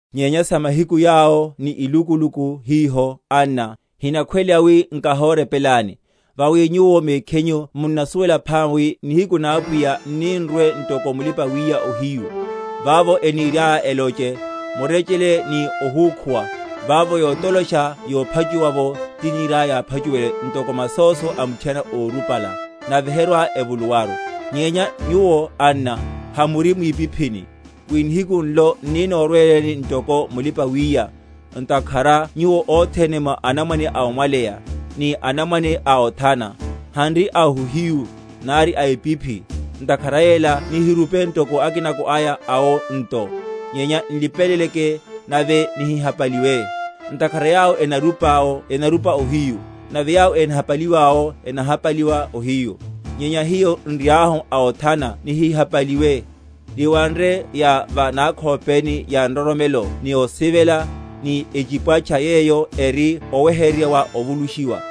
Nyenya sa mahiku yawo ni ilukuluku hiho, anna, hinakhweleya wi nikahorepelani. Vawi nyuwo mekhinyu munnasuwela phama wi nihiku na Apwiya n’ni‐nrwe ntoko mulipa‐wiya ohiyu. Vavo eniriaya eloche, Murechele ni ohúkhuwa, vavo yotolosha yophachuwa’vo tiniriaya yáphachuwele, ntoko masóso a muthiana órupala; nave herwa‐evuluwaru. Nyenya nyuwo, anna, hamuri mwipiphini, wi nihiku nlo n’ni‐norweleni ntoko mulipa‐wiya; ntakhara nyuwo othene mwa anamwane a omwaleya, ni anamwane a othana; hanri a ohiyu, nari a epiphi; ntakhara yela nihirupe ntoko akinako aya awo nto, nyenya nlipeleleke, nave nihihapaliwe. Ntakhara yawo enarupa ’wo enarupa ohiyu; nave yawo enahapaliwa’wo enahapaliwa ohiyu. Nyenya hiyo n’riahu a othana nihihapaliwe, niwanre ya va nakhopeni ya nroromelo ni osivela; ni echipwatcha yeyo eri oweheryerya wa ovulushiwa.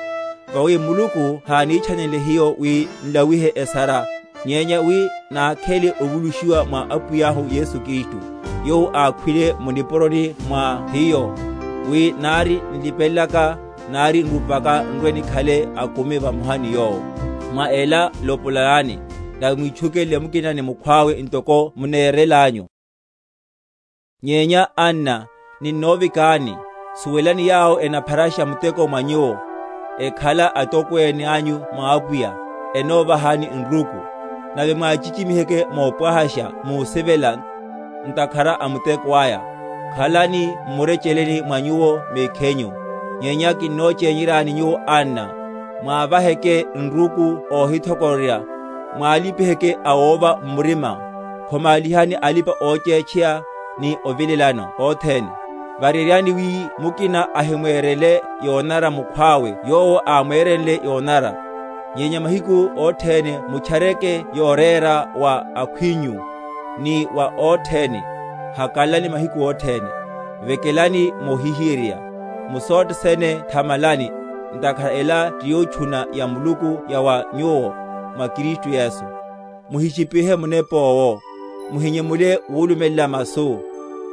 Vawi Muluku hánithanlile hiyo wi nlawihe esara, nyenya wi nákhele ovulushiwa mwa Apwiyahu Yesu Kristu, yowo ákhwile mu nipuroni mwa hiyo, wi, nari nlipelelaka, nari nrupaka, n’rwe‐nikhale akumi vamoha ni Yowo. Mwa ela lopolanani, nave mwitchukelele mukina ni mukhwawe, ntoko munerelanyu. Mathoriheryo, mavekelo. Nyenya, anna, ninnovekani, suwelani yawo enapharasha muteko mwa nyuwo, ekhala atokwene anyu mwa Apwiya, enovahani nruku; nave mwachichimiheke mopwahasha musivela, ntakhara a muteko aya. Khalani m’murecheleni mwa nyuwo mekhinyu. Nyenya ninnochényeryani nyuwo anna, mwávaheke nruku óhithokororya, mwalipiheke awova m’murima, khomálihani alipa‐ochétcheya, ni ovilelano othene. Vareryani wi mukina ahimwerele yonanara mukhwawe yowo ámwerenle yonanara; nyenya mahiku othene mutchareke yorera, wa akhwinyu, ni wa othene. Hakalalani mahiku othene; Vekelani mohihiyeryerya; Mu sothe sene thamalani; ntakhara ela ti yotchuna ya Muluku ya wa nyuwo, mwa Kristu Yesu. Muhishipihe Munepa owo; Muhinyemule wulumelela masu;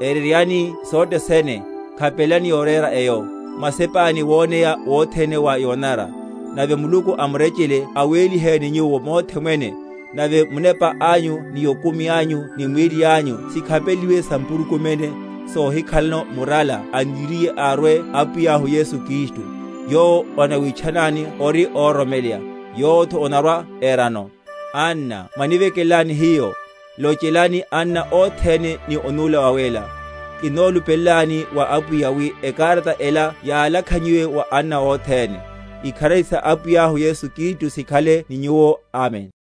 Ereryani sothe sene, khapelelani yorera eyo, Mwasepáni woneya wothene wa yonanara. Nave Muluku a murecheleru awéliheni nyuwo mothe mwene; nave munepa anyu ni okumi anyu ni mwíli anyu sikhapeleliwe sampurukuméne, sohikhalano murala aniriye arwe Apwiyahu Yesu Kristu. Yowo onawitchanani ori óroromeleya, yowotho onarwa‐erano. Anna mwanivekelelani hiyo. Lochelani anna othene ni onula wawéla. Kinnolupelelani wa Apwiya wi ekarata ela yalakhanyiwe wa anna othene. Ikharari sa Apwiyahu Yesu Kristu sikhale ni nyuwo. Amen.